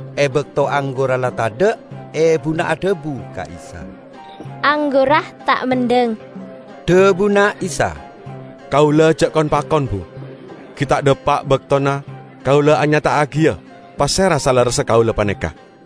E bakto anggurra la tadha', ebuna adhabu ka Isa, "Anggurra ta' mendhang." Dhabuna Isa, "Kaula ja' kon-pakon, Bu. Gi' ta' dhapa' baktona Kaula anyata'agiya pasera salerressa Kaula paneka."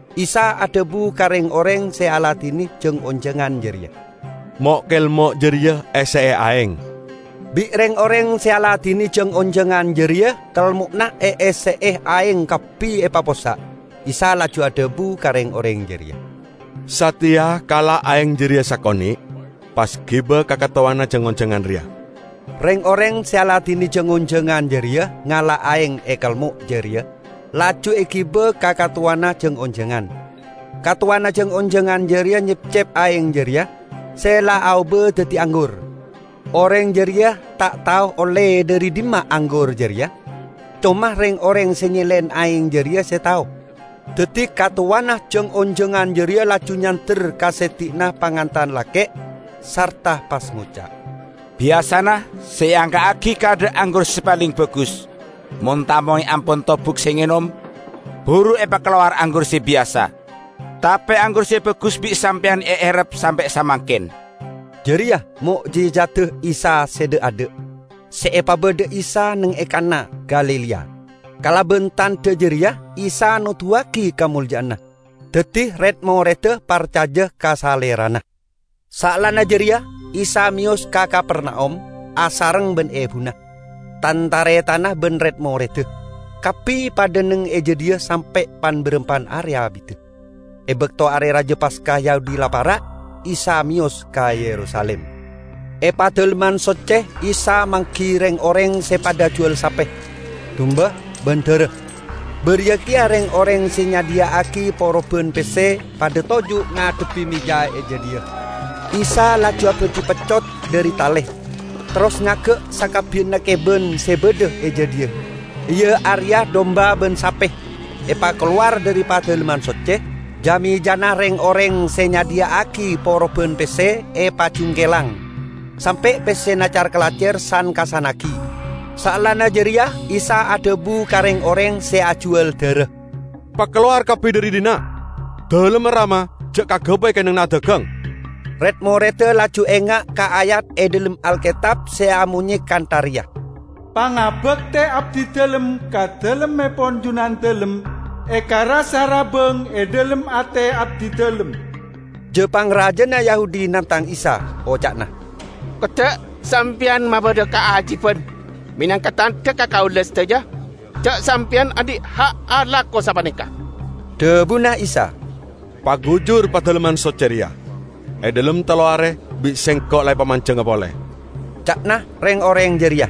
Isa adhabu ka reng-oreng se aladine jang-onjangan jareya, "Mo'-kelmo' jareya esse'e aeng." Bi' reng-oreng se aladine jang-onjangan jareya kelmo'na eesse'e aeng kabbi epapossa'. Isa laju adhabu ka reng-oreng jareya, "Sateya kala' aeng jareya sakone', pas giba ka katowana jang-onjangan reya." Reng-oreng se aladine jang-onjangan jareya ngala' aeng e kelmo' jareya, laju egiba ka katowana jang-onjangan; katowana jang-onjangan jareya nyepcep aeng jareya, se la aoba daddi anggur. (Oreng jareya ta' tao olle dhari dhimma anggur jareya, coma reng-oreng se nyelen aeng jareya se tao.) Daddi katowana jang-onjangan jareya laju nyander ka seddi'na pangantan lake', sarta pas ngoca', "Biyasana se eangka'agi kaadha' anggur se paleng bagus; mon tamoy ampon tobuk se ngenom, buru epakalowar anggur se biyasa. Tape anggur se bagus bi' sampeyan eerrep sampe' samangken!" Jareya mo'jijadda Isa se dha'-adha', se epabadha Isa neng e Kanna, Galilea. Kalaban tandha jareya Isa noduwagi kamolja'anna. Daddi red-moredda parcaja ka Salerana. Saellana jareya, Isa meyos ka Kapernaum asareng ban ebuna, tan-taretanna ban red-moredda. Kabbi padha neng e jadhiya sampe' pan-barampan are abidda. E bakto Are Raja Paska Yahudi la para', Isa meyos ka Yerusalim. E Padalemman Socce Isa manggi reng-oreng se padha ajuwal sape, dumba ban dara; bariya keya reng-oreng se nyadhiya'agi poroban pesse padha toju' ngadhebbi meja e jadhiya. Isa laju abadhi peccot dhari tale, terros ngagga sakabbiyanna keban se badha e jadhiya, iya areya dumba ban sape, epakalowar dhari Padalemman Socce. Ja-mejana reng-oreng se nyadhiya'agi poroban pesse epajungkelang sampe' pessena car-kalacer san-kassannagi. Saellana jareya Isa adhabu ka reng-oreng se ajuwal dara, "Pakalowar kabbi dhari dhinna'. Dalemma Rama ja' kagabay kennengnganna adagang!" Red-moredda laju enga' ka ayat e dhalem Alketab se amonye kantha reya, "Pangabakte abdidalem ka Dalemmepon Junandalem ekarassa rabbang e dhalem ate abdidalem." Ja-pangrajana Yahudi nangtang Isa, oca'na, "Kodda' Sampeyan mabadha kaajiban menangka tandha ka kaula sadaja ja' Sampeyan andhi' ha' alako sapaneka!" Dhabuna Isa, "Pagujur Padalemman Socce reya, e dhalem tello are bi' Sengko' la epamanjengnga pole." Ca'na reng-oreng jareya,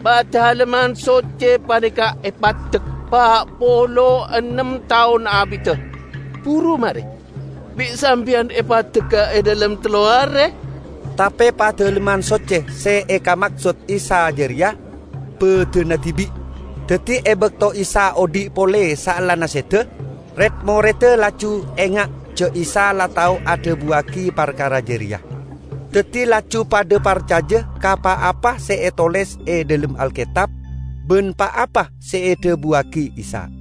"Padalemman Socce paneka epaddek pa' polo ennem taon abidda, buru mare. Bi' sampeyan e paddegga e dhalem tello are?" Tape Padalemman Socce se ekamaksod Isa jareya badanna dibi'. Daddi e bakto Isa odhi' pole saellana seda, red-moredda laju enga' ja' Isa la tao adhabuwagi parkara jareya. Daddi laju padha parcaja ka pa-apa se etoles e dhalem Alketab ban pa-apa se edhabuwagi Isa.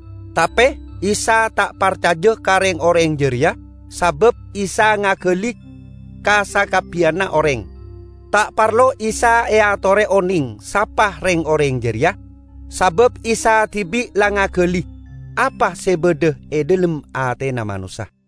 Tape Isa ta' parcaja ka reng-oreng jareya, sabab Isa ngagali ka sakabbiyanna oreng. Ta' parlo Isa eatore oneng sapa reng-oreng jareya, sabab Isa dibi' la ngagali apa se badha e dhalem atena manossa.